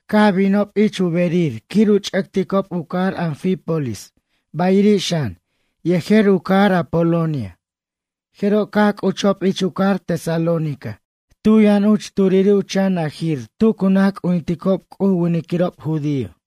Caj binob ich u berir quir u ch'ʌticob u cajar Anfípolis bayiri' xan, yejer u cajar Apolonia, jeroj caj c'uchob ich u cajar Tesalónica tu yʌn uch turiri' u chan najir tu cu naj c'ujinticob C'uj u winiquirob judío.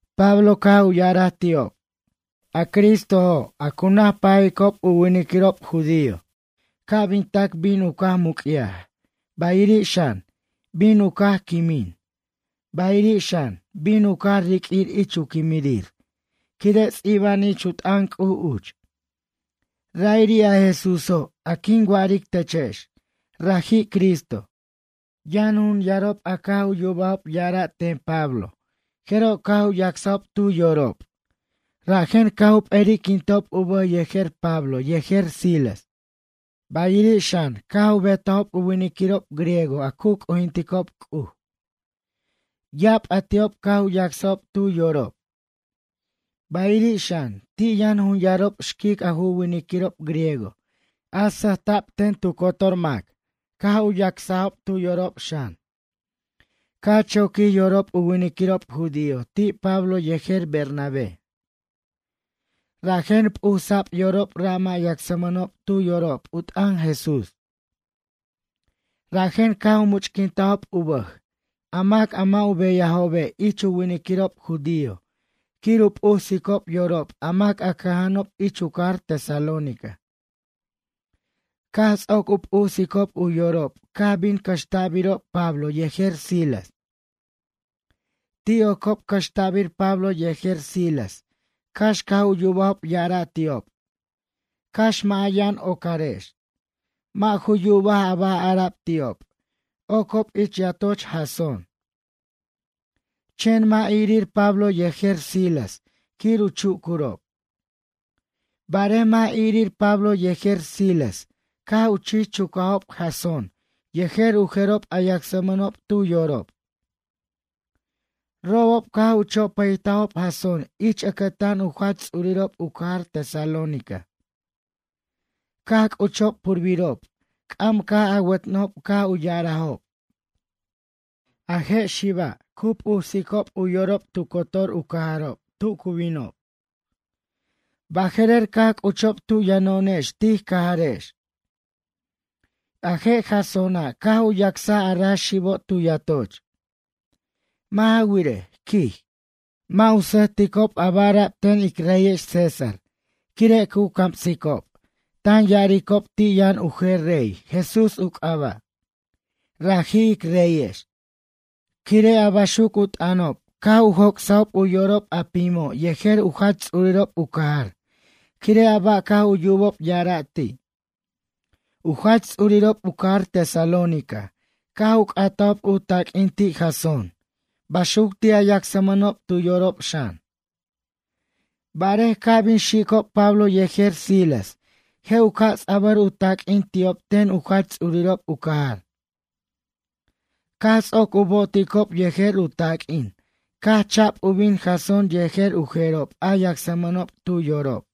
Pablo caj u ya'araj ti'ob: ―A Cristojo', a cu naj pajicob u winiquirob judío, ca' bin tac bin u caj muc'yaj, bayiri' xan, bin u caj quimin, bayiri' xan, bin u caj riq'uir ich u quimirir, quire' ts'iba'an ich u t'an C'uj uch. Ra'iri' a Jesúso', a quin wa'aric techex, raji' Cristo. Yʌn jun yarob a caj u yubajob ya'ara' ten Pablo jeroj caj u yacsajob tu yorob, rajen caj u p'eri'quintob u bʌj yejer Pablo yejer Silas. Bayiri' xan, caj u betajob u winiquirob griego a cu c'ujinticob C'uj. Ya'ab a ti'ob caj u yacsajob tu yorob. Bayiri' xan, ti' yʌn jun yarob xquic a ju winiquirob griego a sʌjta'b ten tu cotor mac caj u yacsajob tu yorob xan. Caj choquij yorob u winiquirob judío ti' Pablo yejer Bernabé. Rajen p'usa'b yorob ra' mʌ' yacsmʌnob tu yorob u t'ʌn Jesús. Rajen caj u much'quintajob u bʌj, a mac a mʌ' u beyajobe' ich u winiquirob judío, quir u p'usicob yorob a mac a cʌja'anob ich u cajar Tesalónica. Caj ts'oc u p'usicob u yorob caj bin cʌxta'birob Pablo yejer Silas. Ti' ocob cʌxta'bir Pablo yejer Silas cax caj u yubajob ya'ara' ti'ob: “Cax mʌ' a yʌn ocarex.” Mʌ' ju yubaj a ba' ara'b ti'ob, ocob ich yatoch Jasón. Chen mʌ' irir Pablo yejer Silas quir u chucurob. Barej mʌ' irir Pablo yejer Silas caj u chich chucajob Jasón yejer u jerob a yacsmʌnob tu yorob. Robob caj u chopʌytajob Jasón ich ʌcʌtan u jach ts'urirob u cajar Tesalónica. Caj c'uchob purbirob, c'am caj awʌtnʌjob caj u ya'arajob: ―A je' xiba' cu p'usicob u yorob tu cotor u cajarob tu cu binob. Baje'rer caj c'uchob tu yʌno'onex tij cajarex. A je' Jasóna', caj u yacsaj a ra xibo' tu yatoch. Mʌ' ja wirej ―quij―, mʌ' u sʌjticob a ba' ara'b ten ic reyex César, quire' cu camsicob, tan ya'aricob ti' yʌn u jer rey, Jesús u c'aba'. Raji' ic reyex. Quire', a baxuc u t'ʌnob, caj u joc'sajob u yorob a pimo' yejer u jach ts'urirob u cajar, quire' a ba' caj u yubob ya'ara' ti'. U jach ts'urirob u cajar Tesalónica, caj u c'atajob u taq'uin ti' Jasón, baxuc ti' a yacsmʌnob tu yorob xan. Barej ca' bin xicob Pablo yejer Silas, je' u ca' ts'abʌr u taq'uin ti'ob ten u jach ts'urirob u cajar. Caj ts'oc u bo'oticob yejer u taq'uin, caj cha'b u bin Jasón yejer u jerob a yacsmʌnob tu yorob.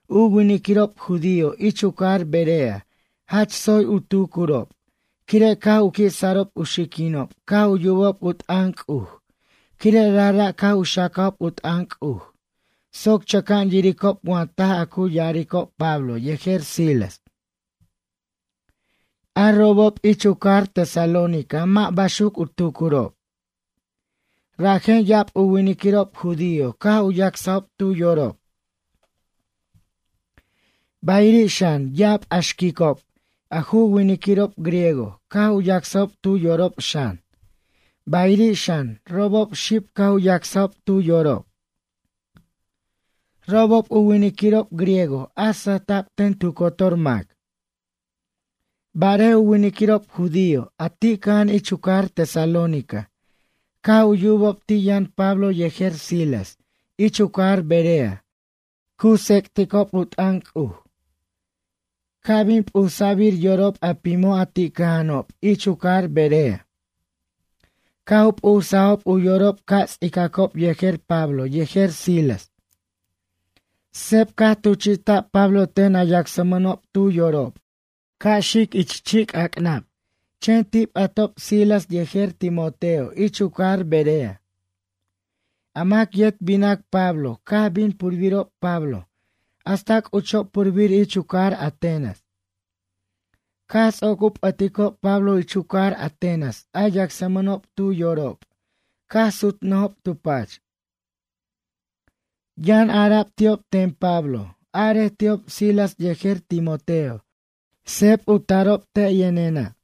U winiquirob judío ich u cajar Berea jach tsoy u tucurob, quire' caj u qui' sarob u xiquinob caj u yubob u t'ʌn C'uj, quire' rajra' caj u xacajob u t'ʌn C'uj, soc chʌca'an yiricob wa taj a cu ya'aricob Pablo yejer Silas. A robob ich u cajar Tesalónica mʌ' baxuc u tucurob. Rajen ya'ab u winiquirob judío caj u yacsajob tu yorob. Bayiri' xan, ya'ab a xquicob, a ju winiquirob griego, caj u yacsajob tu yorob xan, bayiri' xan, robob xib caj u yacsajob tu yorob. Robob u winiquirob griego a sʌjta' ten tu cotor mac. Barej u winiquirob judío, a ti' cʌja'an ich u cajar Tesalónica, caj u yubob ti' yʌn Pablo yejer Silas ich u cajar Berea cu tsec'ticob u t'ʌn C'uj. Caj bin p'usa'bir yorob a pimo' a ti' cʌja'anob ich u cajar Berea. Caj u p'usajob u yorob ca' ts'icacob yejer Palo yejer Silas. Seb caj tuchi'ta'b Pablo ten a yacsmʌnob tu yorob ca' xic ich chi'c'ac'nab, chen ti' p'atob Silas yejer Timoteo ich u cajar Berea. A mac yet binac Pablo caj bin purbirob Pablo hasta c'uchob purbir ich u cajar Atenas. Caj ts'oc u p'ʌticob Pablo ich u cajar Atenas a yacsmʌnob tu yorob caj sutnʌjob tu pach. Yʌn ara'b ti'ob ten Pablo: ―Arej ti'ob Silas yejer Timoteo, seb u tarob te' yʌnena'.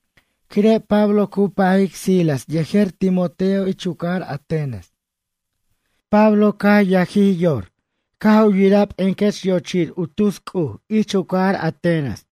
Quire' Pablo cu pajic Silas yejer Timoteo ich u cajar Atenas. Pablo caj yajij yor caj u yiraj p'encʌch yochir u tus c'uj ich u cajar Atenas.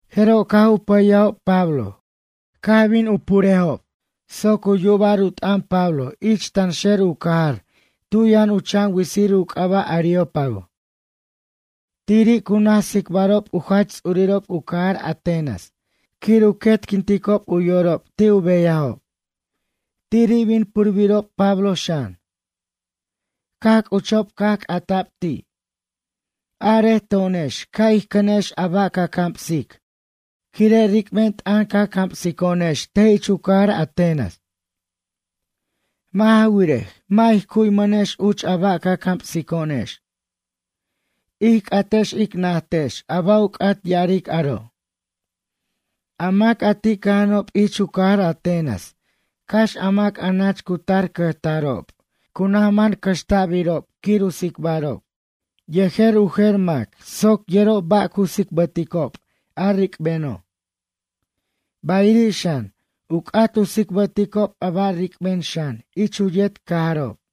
Jeroj caj u pʌyajob Pablo, caj bin u purbob soc u yuba'r u t'ʌn Pablo ich tanxer u cajar tu yʌn u chan witsir u c'aba' Areópago. Tiri' cu naj tsicbarob u jach ts'urirob u cajar Atenas quir u quetquinticob u yorob ti' u beyajob. Tiri' bin purbirob Pablo xan. Caj c'uchob caj c'ata'b ti': ―Arej to'onex ca' ij cʌnex a ba' ca camsic, quire' ric'ben t'ʌn ca camsico'onex te' ich u cajar Atenas. Mʌ' ja wirej, mʌ' ij cu'ymʌnex uch a ba' ca camsico'onex. Ij c'atex ic najtex a ba' u c'at ya'aric aro'. A mac a ti' cʌja'anob ich u cajar Atenas, cax a mac a nach cu tar cʌjtarob, cu naj man cʌxta'birob quir u tsicbarob yejer u jer mac, soc yerob ba' cu tsicbʌticob a ric'beno'. Bayiri' xan, u c'at u tsicbʌticob a ba' ric'ben xan, ich u yet cajarob.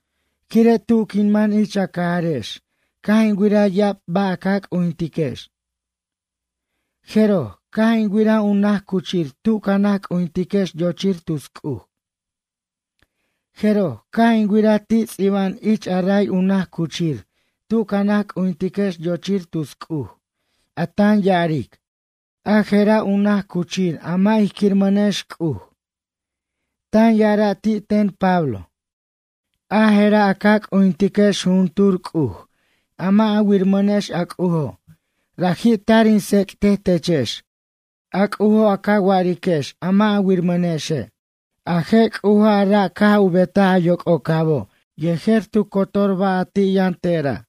Quire' tu quin man ich a cajarex caj in wiraj ya'ab ba' a ca c'ujintiquex. Jeroj, caj in wiraj u naj cuchir tu ca naj c'ujintiquex yochir tus c'uj. Jeroj, caj in wiraj ti' ts'iba'an ich a ray u naj cuchir tu ca naj c'ujintiquex yochir tus c'uj, a tan ya'aric: “A je'ra' u naj cuchir a mʌ' ij quiramʌnex c'uj.” Tan ya'ara' ti' ten Pablo. A jera' a ca c'ujintiquex jujuntur c'uj, a mʌ' a wiramʌnex, a C'ujo' raji' tar in tsec'tej techex, a C'ujo' a ca wa'ariquex a mʌ' a wiramʌnexe'. ’A je' C'uja', a ra' caj u betaj a yoc'ocabo' yejer tu cotor ba' a ti' yʌn te'ra'.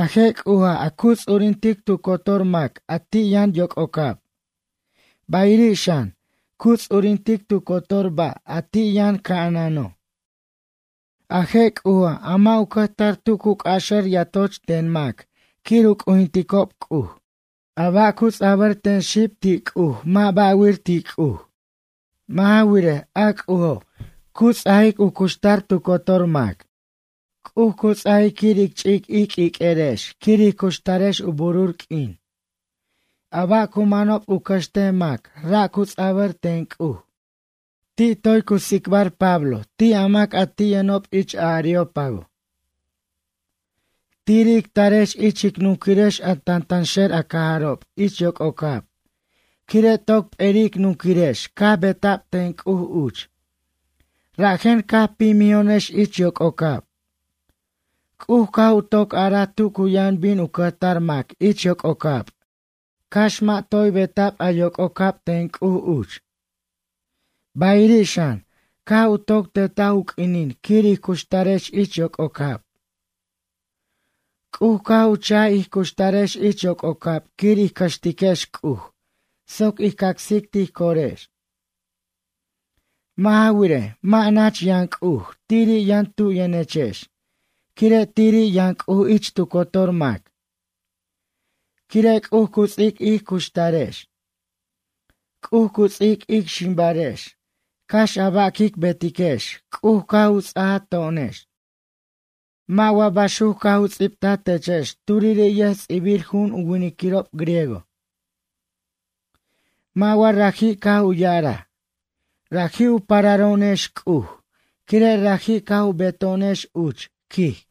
A je' C'uja', a cu ts'urintic tu cotor mac a ti' yʌn yoc'ocab, bayiri' xan, cu ts'urintic tu cotor ba' a ti' yʌn ca'anano'. A je' C'uja', a mʌ' u cʌjtar tu cu c'axʌr yatoch ten mac quir u c'ujinticob C'uj. A ba' cu ts'abʌr ten xib ti' C'uj mʌ' ba'wir ti' C'uj. Mʌ' ja wirej, a C'ujo', cu ts'ajic u cuxtar tu cotor mac. C'uj cu ts'ajic quir ic ch'ic ij q'uiq'uerex quir ij cuxtarex u burur q'uin. A ba' cu manob u cʌxtej mac ra' cu ts'abʌr ten C'uj. Ti' toy cu tsicbar Pablo ti' a mac a ti' yʌnob ich a Areópago: ―Tiri' ic tarex ich ic nunquirex a tantanxer a cajarob ich yoc'ocab, quire' toc p'eri' ic nunquirirex caj beta'b ten C'uj uch, rajen caj pimijo'onex ich yoc'ocab. C'uj caj u toc araj tu cu yʌn bin u cʌjtar mac ich yoc'ocab, cax mʌ' toy beta'b a yoc'ocab ten C'uj uch. Bayiri' xan, caj u toc tetaj u q'uinin quir ij cuxtarex ich yoc'ocab. C'uj caj u cha'j ij cuxtarex ich yoc'ocab quir ij cʌxtiquex C'uj soc ij cacsic tij corex. Mʌ' ja wirej, mʌ' nach yʌn C'uj, tiri' yʌn tu yʌnechex, quire' tiri' yʌn C'uj ich tu cotor mac. Quire' C'uj cu ts'ic ic cuxtarex. C'uj cu ts'ic ic ximbarex, cax a ba' quic betiquex C'uj, caj u ts'ajaj to'onex. Mʌ' wa baxuc caj u ts'ibtaj techex turiri' yʌjts'ibirju'un u winiquirob griego? Mʌ' wa raji' caj u ya'araj: “Raji' u pararo'onex C'uj quire' raji' caj u beto'onex uch, quij.”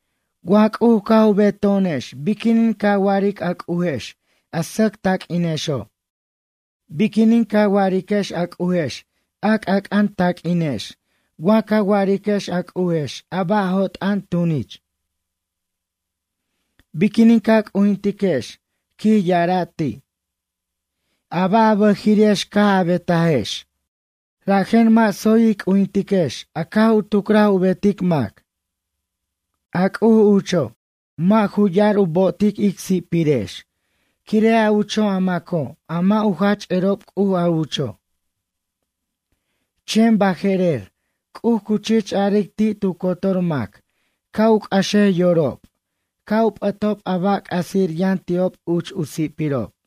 Wa C'uj caj u beto'onex biquinin ca wa'aric a c'ujex a sʌc taq'uinexo'? Biquinin ca wa'ariquex a C'ujex a c'ʌn c'ʌn taq'uinex wa ca wa'ariquex a C'ujex a ba' jo't'ʌn tunich? Biquinin ca c'ujintiquex ―quij ya'araj ti'―, a ba' a bʌjiri'ex caj a betajex? Rajen mʌ' tsoy ij c'ujintiquex a caj u tucraj u betic mac. A C'uj ucho', mʌ' ju ya'ar u bo'otic ic si'pirex, quire' a ucho' a maco' mʌ' u jach erob C'uj a ucho'. Chen baje'rer, C'uj cu chich aric ti' tu cotor mac ca' u c'axej yorob, ca' u p'ʌtob a ba' c'asir yʌn ti'ob uch, u si'pirob.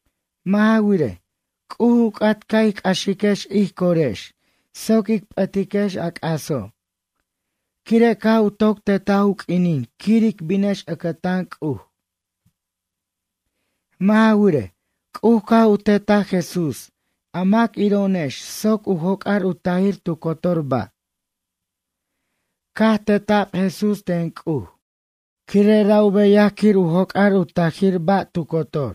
Mʌ' ja wirej, C'uj u c'at ca' ij c'axiquex ij corex soc ic p'ʌtiquex a c'aso', quire' caj u toc tetaj u q'uinin quir ic binex ʌcʌtan C'uj. Mʌ' ja wirej, C'uj caj u tetaj Jesús a mac iro'onex soc u joc'ar u tajir tu cotor ba'. Caj teta'b Jesús ten C'uj, quire' ra' u beyaj quir u joc'ar u tajir ba' tu cotor.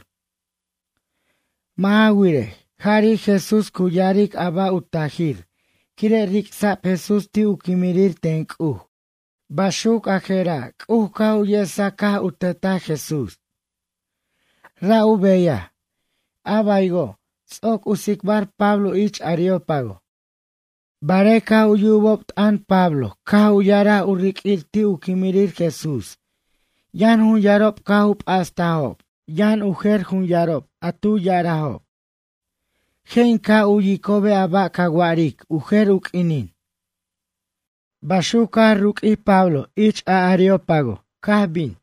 Mʌ' ja wirej, jari' Jesús cu ya'aric a ba' u tajir quire' ric'sa'b Jesús ti' u quimirir ten C'uj. Baxuc a jera' C'uj caj u yesaj caj u tetaj Jesús. Ra' u beyaj ―a baywo' ts'oc u tsicbar Pablo ich a Areópago. Barej caj u yubob t'ʌn Pablo caj u ya'araj u riq'uir ti' u quimirir Jesús yʌn jun yarob caj u p'astajob, yʌn u jer jun yarob a tu ya'arajob: ―Je' in ca' u'yicobe' a ba' ca wa'aric u jer u q'uinin. Baxuco', caj ruq'uij Pablo ich a Areópago caj bin.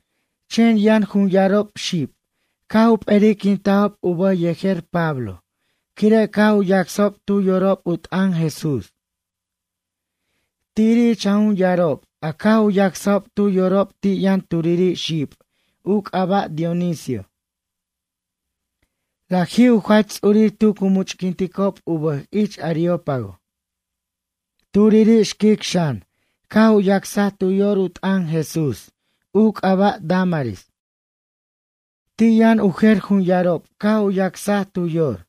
Chen yʌn jun yarob xib, caj u p'eri'quintajob u bʌj yejer Pablo, quire' caj u yacsajob tu yorob u t'ʌn Jesús. Tiri' ich a jun yarob, a caj u yacsajob tu yorob ti' yʌn turiri' xib u c'aba' Dionisio. Raji' u jach ts'urir tu cu much'quinticob u bʌj ich Areópago. Turiri' xquic xan, caj u yacsaj tu yor u t'ʌn Jesús, u c'aba' Dámaris. Ti' yʌn u jer jun yarob caj u yacsaj tu yor.